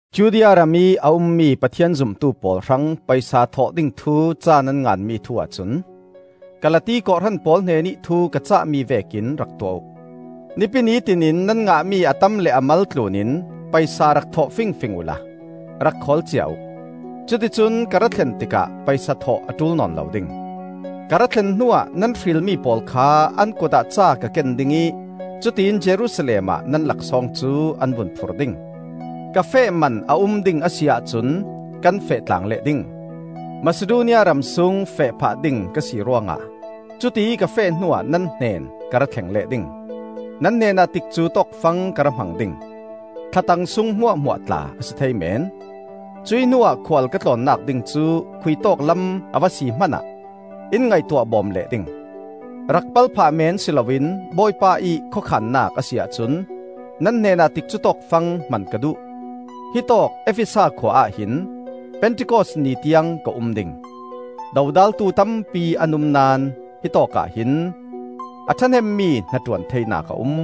Judea ramih a ummi Pathian zumtu pawl hrang paisa thawh ding thu ca nan nganmi thu-ah cun: Kalati kawhhran pawl hnenih thu ka cahmi vekin rak tuah uh. Nipi ni tinin nan ngahmi a tam le a mal thlunin paisa rak thawh fingfing uhla rak khawl cia uh; cuticun ka ra thlen tikah paisa thawh a ṭul nawn lo ding. Ka ra thlen hnuah nan hrilmi pawl kha an kutah ca ka ken ding ih cutiin Jerusalem ah nan laksawng cu an vun phur ding. Ka feh man a um ding a si ahcun kan feh tlang leh ding. Masidonia ramsung feh phah ding ka si ruangah, cutiih ka feh hnuah nan hnen ka ra thleng leh ding. Nan hnenah tikcu tawkfang ka ra hmang ding; thlatang sung hmuahhmuah tla a si thei meen; cuih hnuah khual ka tlawnnak ding cu khuitawk lam a va si hmanah in ngaihtuah bawm leh ding. Rak pal phah meen si loin, Bawipa ih khawkhannak a si ahcun, nan hnenah tikcu tawkfang hman ka duh. Hitawk Efesa khua ah hin Pentikos ni tiang ka um ding. Dodaltu tampi an um naón hitawk ahhin a ṭhahnemmi hnaṭuan theinak a um.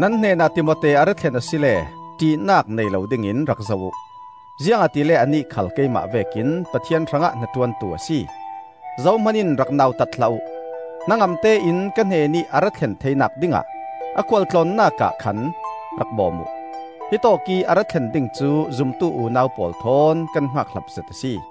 Nan hnenah Timote a ra thlen asile ṭihnak nei lo dingin rak zoh uh, ziangahtile anih khal keimah vekin Pathian hrangah hnaṭuantu a si. Zohman in rak nautat hlah uh; hnangamte in ka hnenih a ra thlen theinak dingah a khualtlawnnak ah khan rak bawm uh. Hitawkih a ra thlen ding cu zumtu unau pawl thawn kan hngakhlap zet a si.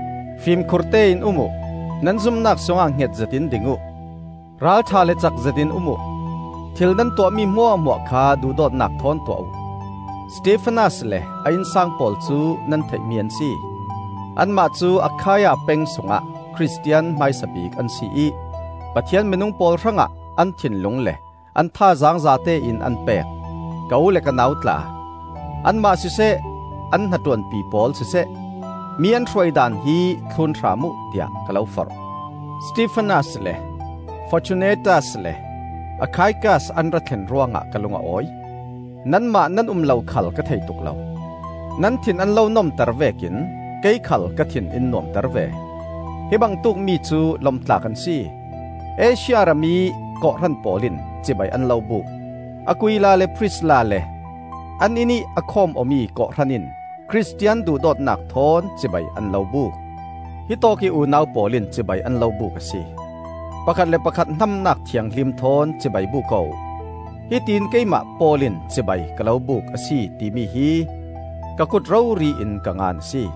Fimkhurte in um uh, nan zumnak sungah hngetzet in ding uh; ral ṭha le cakzetin um uh. Thil nan tuahmi hmuahhmuah kha duhdawtnak thawn tuah uh. Stefanas le a innsang pawl cu nan theihmi an si. Anmah cu Akhaia peng sungah Khristian hmaisa bik an si ih Pathian minung pawl hrangah an thinlung le an thazaang zatein an pek. Ka u le ka nau tla, anmah siseh, an hnaṭuanpi pawl siseh, mi an hruai daan hi thlun hram uh tiah ka lo forh. Stefanas le Fortunatas le Akhaikas an ra thlen ruangah ka lung a awi; nanmah nan um lo khal ka thei tuk lo. Nan thin an lo nomter vekin kei khal ka thin in nuamter ve. Hi bangtukmi cu lom tlak an si. Asia ramih kawhhran pawl in cibai an lo buk; Aquila le Prisilla le an inn ih a khawm-awmi kawhhran in Khristian duhdawtnak thawn cibai an lo buk. Hitawkih unau pawl in cibai an lo buk a si. Pakhat le pakhat hnamnak thianghlim thawn cibai buk aw uh. Hitiin Keimah Paul in cibai ka lo buk a si timi hi ka kut rori in ka ngan a si.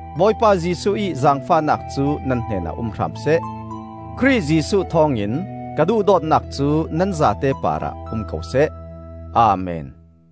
Bawipa Jesuh ih zaangfahnak cu nan hnenah um hram seh. Khrih Jesuh thawngin ka duhdawtnak cu nan zate parah um ko seh. Amen.